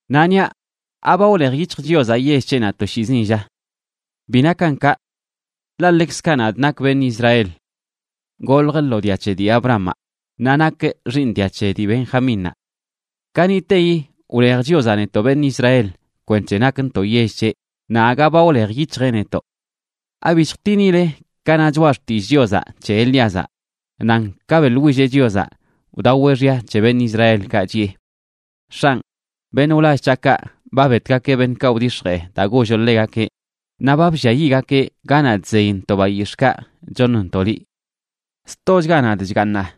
Naꞌ niaꞌ ¿aba wlej yic̱hj Chiozaꞌ yell c̱heꞌnaꞌ toshiizin, lla? ¡Bi nakan kaꞌ! Ḻaꞌ ḻekzkaꞌ nadꞌ nakꞌ beṉꞌ Israel. Goljꞌ lo dia c̱he dii Abrahamaꞌ naꞌ nakꞌ xiiṉ dia c̱he dii Benjamínnaꞌ. Kaniꞌteyi wlej Chiozaꞌ netoꞌ beṉꞌ Israel kwenc̱he nakntoꞌ yell c̱heꞌ, naꞌ aga ba wlej yic̱hjeꞌ netoꞌ. ¿Abi chjtinile ka na Choꞌa Xtillꞌ Chiozaꞌ c̱he Elíazaꞌ? nan ka beꞌḻwilleꞌ Chiozaꞌ wdaweꞌ xya c̱he beṉꞌ Israelkaꞌ, chiꞌe: “X̱anꞌ, beṉꞌ wlall c̱haꞌkaꞌ ba betgakeꞌ beṉꞌkaꞌ wdix̱jee daa golloꞌ ḻegakeꞌ naꞌ ba blliayiꞌgakeꞌ ganaꞌ chzeyntoꞌ bayix̱ꞌkaꞌ choṉntoꞌ liꞌ. Stochga nadꞌ chgaaṉaꞌ,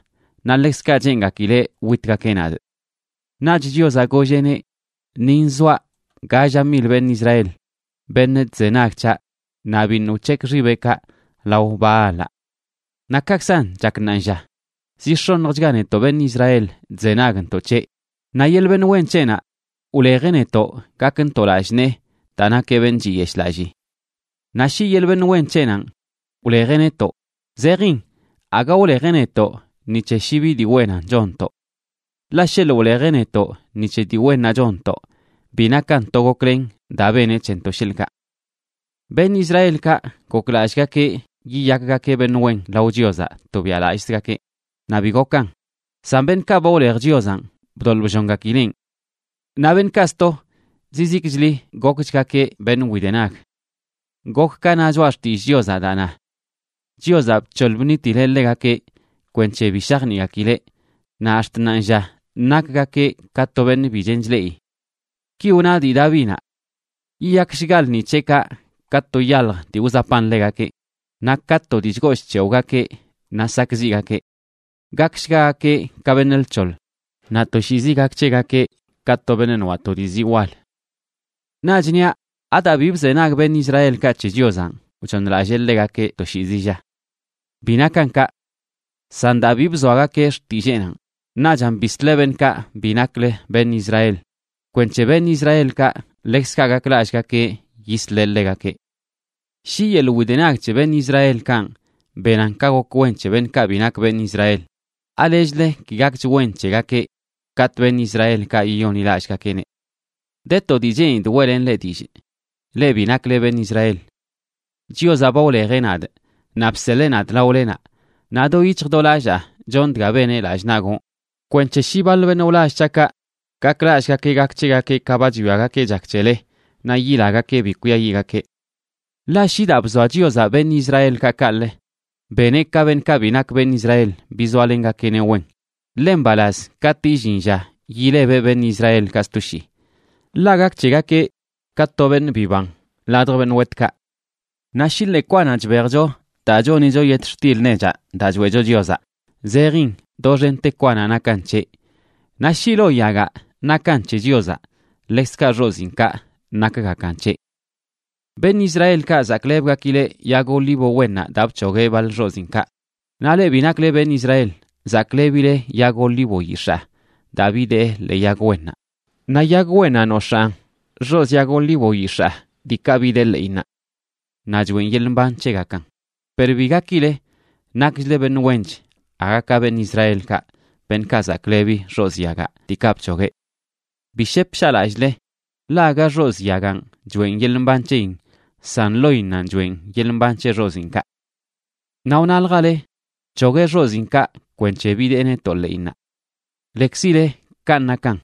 naꞌ ḻekzkaꞌ cheengakileꞌ witgakeꞌ nadꞌ.” Naꞌch Chiozaꞌ golleꞌneꞌ: “Ni nzoaꞌ galla mil beṉꞌ Israel, beṉꞌ chzenag c̱haꞌ naꞌ biṉꞌ wc̱hekꞌ xibeꞌkaꞌ lao Baalaꞌ.” Naꞌ kaꞌkzan chak ṉaanlla, zi x̱onjchga netoꞌ beṉꞌ Israel chzenagntoꞌ c̱heꞌ. Naꞌ yeḻꞌ beṉꞌ wen c̱heꞌnaꞌ wlejeꞌ netoꞌ gakntoꞌ lallꞌ nee daa nakeꞌ beṉꞌ chiyeshꞌlallii. Naꞌ shi yeḻꞌ beṉꞌ wen c̱heꞌnanꞌ wlejeꞌ netoꞌ, zejin aga wlejeꞌ netoꞌ ni c̱he shi bi dii wennan chonntoꞌ. Ḻaꞌ sheḻꞌ wlejeꞌ netoꞌ ni c̱he dii wennaꞌ chonntoꞌ, bi nakan to goklen daa beneꞌ c̱hentoꞌ, sheḻꞌkaꞌ. Beṉꞌ Israelkaꞌ goklallꞌgakeꞌ yiyakgakeꞌ beṉꞌ wen lao Chiozaꞌ tobiaꞌlallꞌzgakeꞌ, naꞌ bi gokan, san beṉꞌkaꞌ ba wlej Chiozanꞌ bdoḻꞌ bllongakileꞌn. Naꞌ beṉꞌkaꞌ sto, zizikchli gokchgakeꞌ beṉꞌ widenag. Gok ka na Choꞌa Xtillꞌ Chiozaꞌ daa na: “Chiozaꞌ bc̱hoḻ bṉitileꞌ ḻegakeꞌ kwenc̱he bi shajniꞌgakileꞌ. Naꞌ ax̱t ṉaanlla nakgakeꞌ ka to beṉꞌ bi chen chleꞌi.” Ki wna dii Davinaꞌ: “Yiyakshga lṉi c̱heꞌkaꞌ ka to yalj dii wzapan ḻegakeꞌ, naꞌ ka to dii chgoo chc̱hewꞌgakeꞌ, naꞌ sakꞌziꞌgakeꞌ. Gakshgagakeꞌ ka beṉꞌ lc̱hoḻ; naꞌ toshiizi gak c̱hegakeꞌ ka to beṉꞌ noaꞌ to dii zii wal.” Naꞌch niaꞌ: ¿Adaa bi bzenag beṉꞌ Israelkaꞌ c̱he Chiozanꞌ wchooṉlallee ḻegakeꞌ toshiizi, lla? ¡Bi nakan kaꞌ! San daa bi bzoagakeꞌ xtilleenanꞌ, naꞌchan bisleꞌ beṉꞌkaꞌ bi naklə beṉꞌ Israel kwenc̱he beṉꞌ Israelkaꞌ ḻekzkaꞌ gaklallꞌgakeꞌ yisleꞌ ḻegakeꞌ. Shi yeḻꞌ widenag c̱he beṉꞌ Israelkanꞌ benan ka gok wen c̱he beṉꞌkaꞌ bi nak beṉꞌ Israel, ¿alechlə ki gakch wen c̱hegakeꞌ katꞌ beṉꞌ Israelkaꞌ yiyonḻilallꞌgakeꞌneꞌ? De to dii cheenidꞌ weꞌlenꞌ leꞌ dillꞌ, leꞌ bi nakle beṉꞌ Israel. Chiozaꞌ ba wlejeꞌ nadꞌ naꞌ bseḻee nadꞌ laolenaꞌ. Naꞌ do yic̱hj do lallaa chonꞌ dga beneꞌ lallꞌ naꞌ gonꞌ, kwenc̱he shi baḻ beṉꞌ wlall c̱haꞌkaꞌ gaklallꞌgakeꞌ gak c̱hegakeꞌ ka ba chwiagakeꞌ chak c̱hele, naꞌ yilagakeꞌ bi kwiayiꞌgakeꞌ. Ḻaꞌ shi daa bzoa Chiozaꞌ beṉꞌ Israelkaꞌ kaꞌlə, beneꞌ ka beṉꞌkaꞌ bi nak beṉꞌ Israel bizoalengakeꞌneꞌ wen, ḻe mbalaz katꞌ illin lla yilebeꞌ beṉꞌ Israelkaꞌ sto shii. Ḻaꞌ gak c̱hegakeꞌ ka to beṉꞌ biban ladj beṉꞌ wetkaꞌ. Naꞌ shi ḻee kwanaꞌ chbejcho daa chonicho yetxtil nechaꞌ daa choeꞌcho Chiozaꞌ, zejin doxente kwanaꞌ nakan c̱heꞌ. Naꞌ shi lo yagaꞌ nakan c̱he Chiozaꞌ, ḻekzkaꞌ xoziinkaꞌ nakgakan c̱heꞌ. Beṉꞌ Israelkaꞌ zaklebgakileꞌ yag olivo wennaꞌ daa bc̱hogueꞌ baḻ xoziinkaꞌ, naꞌ leꞌ bi nakle beṉꞌ Israel zaklebileꞌ yag olivo yix̱aa daa bidee ḻee yag wennaꞌ. Naꞌ yag wennaꞌ nox̱aan xozii yag olivo yix̱aa diikaꞌ bidee ḻeꞌinnaꞌ naꞌ choꞌen yeḻꞌ mban c̱hegakan. Per bi gakile nakchle beṉꞌ wench aga ka beṉꞌ Israelkaꞌ, beṉꞌkaꞌ zaklebi xozꞌ yagaꞌ diikaꞌ bc̱hogueꞌ. Bi shep shaꞌlallꞌle, ḻaꞌ aga xozꞌ yaganꞌ choꞌen yeḻꞌ mban c̱heyin san loinnanꞌ choeꞌn yeḻꞌ mban c̱he xoziinkaꞌ. Naꞌ wnaljale: “Bc̱hogueꞌ xoziinkaꞌ kwenc̱he bidee netoꞌ ḻeꞌinnaꞌ.” Lekzile kanꞌ nakan,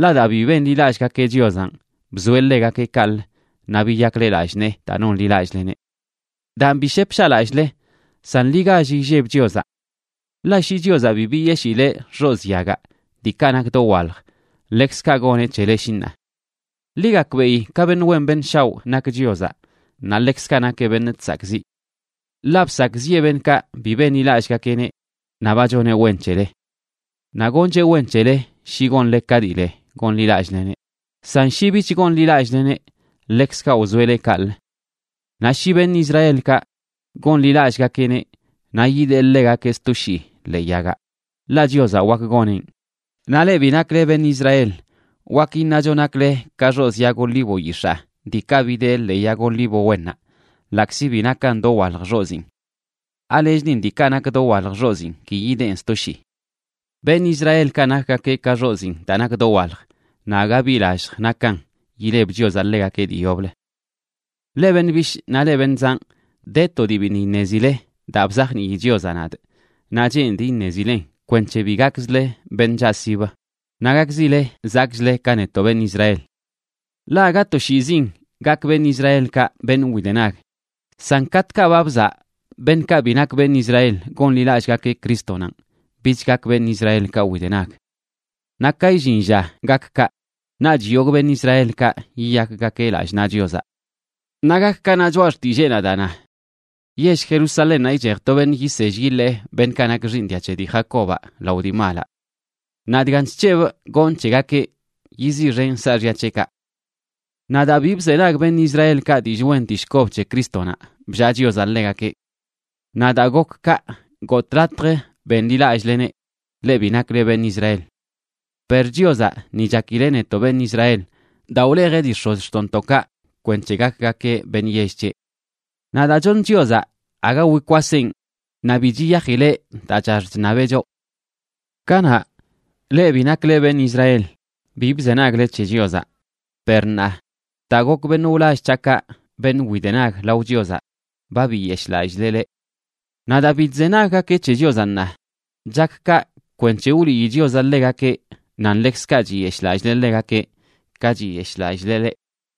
ḻaꞌ daa bi benḻilallꞌgakeꞌ Chiozanꞌ, bzoeꞌ ḻegakeꞌ kaꞌlə, naꞌ biyakle lallꞌ nee daa nonḻilallꞌleneꞌ. Daan, bi shep shaꞌlallꞌle, san ḻi gall illeb Chiozaꞌ. Ḻaꞌ shi Chiozaꞌ bi biyeshileꞌ xozꞌ yagaꞌ diikaꞌ nak dowalj, ḻekzkaꞌ goneꞌ c̱hele shi ṉaa. Ḻi gakbeꞌi ka beṉꞌ wen beṉꞌ shaoꞌ nak Chiozaꞌ naꞌ ḻekzkaꞌ nakeꞌ beṉꞌ chsakꞌziꞌ. Ḻaꞌ bsakꞌziꞌe beṉꞌkaꞌ bi benḻilallꞌgakeꞌneꞌ, naꞌ ba choneꞌ wen c̱hele. Naꞌ goncheꞌ wen c̱hele shi gonle ka dii le gonḻilallꞌleneꞌ, san shi bich gonḻilallꞌleneꞌ ḻekzkaꞌ wzoeꞌ leꞌ kaꞌlə. Naꞌ shi beṉꞌ Israelkaꞌ gonḻilallꞌgakeꞌneꞌ, naꞌ yidee ḻegakeꞌ sto shii ḻee yagaꞌ, ḻaꞌ Chiozaꞌ wak goneꞌn. Naꞌ leꞌ bi nakle beṉꞌ Israel, wak iṉacho nakle ka xozꞌ yag olivo yix̱aa diikaꞌ bidee ḻee yag olivo wennaꞌ, ḻaꞌkzi bi nakan dowalj xoziin. ¿Alechlin diikaꞌ nak dowalj xoziin ki yideen sto shii? Beṉꞌ Israelkaꞌ nakgakeꞌ ka xoziin daa nak dowalj, naꞌ aga bi lallj nakan yileb Chiozaꞌ ḻegakeꞌ dii yoblə. Leꞌ beṉꞌ bishꞌ naꞌ leꞌ beṉꞌ zanꞌ, de to dii biṉꞌ iṉezile daa bzajnii Chiozaꞌ nadꞌ, naꞌ cheenidꞌ iṉezilen kwenc̱he bi gakzle beṉꞌ chaꞌsib naꞌ gakzile zakꞌchle ka netoꞌ beṉꞌ Israel. Ḻaꞌ aga toshiizin gak beṉꞌ Israelkaꞌ beṉꞌ widenag, san katꞌkaꞌ ba bzaꞌ beṉꞌkaꞌ bi nak beṉꞌ Israel gonḻilallꞌgakeꞌ Crístonanꞌ, bich gak beṉꞌ Israelkaꞌ widenag. Naꞌ ka illin lla gak kaꞌ, naꞌch yogꞌ beṉꞌ Israelkaꞌ yiyakgakeꞌ lallꞌ naꞌ Chiozaꞌ. Naꞌ gak ka na Choꞌa Xtilleenaꞌ daa na: Yell Jerusalénnaꞌ ichej to beṉꞌ yisell yiḻee beṉꞌkaꞌ nak xiiṉ dia c̱he dii Jacobaꞌ lao dii malaꞌ. Naꞌ dgan chc̱hebꞌ gonꞌ c̱hegakeꞌ, yiziꞌxenꞌ saaxya c̱heꞌkaꞌ. Naꞌ daa bi bzenag beṉꞌ Israelkaꞌ dillꞌ wen dillꞌ kob c̱he Crístonaꞌ, bllaa Chiozaꞌ ḻegakeꞌ. Naꞌ daa gok kaꞌ gotꞌ latj benḻilallꞌleneꞌ, leꞌ bi nakle beṉꞌ Israel. Per Chiozaꞌ ni chakileꞌ netoꞌ beṉꞌ Israel daa wlejeꞌ dii x̱ozxtoꞌntoꞌkaꞌ kwenc̱he gakgakeꞌ beṉꞌ yell c̱heꞌ. Naꞌ daa choṉ Chiozaꞌ, aga wikwaseꞌn naꞌ bi chiyajileꞌ daa chax chṉabeꞌ choꞌ. Kanaꞌ, leꞌ bi nakle beṉꞌ Israel, bi bzenagle c̱he Chiozaꞌ. Per ṉaa, daa gok beṉꞌ wlall c̱haꞌkaꞌ beṉꞌ widenag lao Chiozaꞌ, ba biyeshꞌlallileꞌ leꞌ. Naꞌ daa bi chzenaggakeꞌ c̱he Chiozaꞌ ṉaa, chak kaꞌ kwenc̱he wliyi Chiozaꞌ ḻegakeꞌ nan ḻekzkaꞌ chiyeshꞌlallileꞌ ḻegakeꞌ ka chiyeshꞌlallileꞌ leꞌ.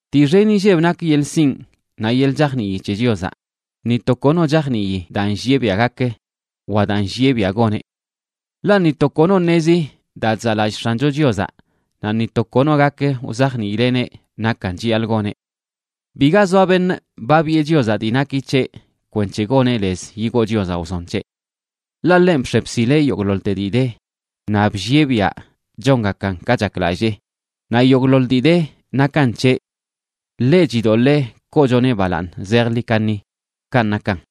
¡Dii xen inlleb nak yeḻꞌ sinꞌ naꞌ yeḻꞌ chajnii c̱he Chiozaꞌ! ¡Ni to kono chajnii daa nllieꞌ biaꞌ gak wa daa nllieꞌ biaꞌ goneꞌ! Ḻaꞌ “ni to kono ṉezi daa chzaꞌlallꞌ X̱ancho Chiozaꞌ, naꞌ ni to kono gak wzajniileꞌneꞌ nakan chiyaḻꞌ goneꞌ. Biga zoa beṉꞌ ba biꞌe Chiozaꞌ dii naki c̱heꞌ kwenc̱he goneꞌ lez yigoo Chiozaꞌ wzon c̱heꞌ.” Ḻaꞌ ḻenꞌ bx̱e bsileꞌ yogꞌḻoḻte dii de naꞌ bllieꞌ biaꞌ chongakan ka chaklallee, naꞌ yogꞌḻoḻ dii de nakan c̱heꞌ. ¡Ḻeꞌ chidoḻee koochoneꞌ balaaṉ zejḻi kaṉi! Kanꞌ nakan.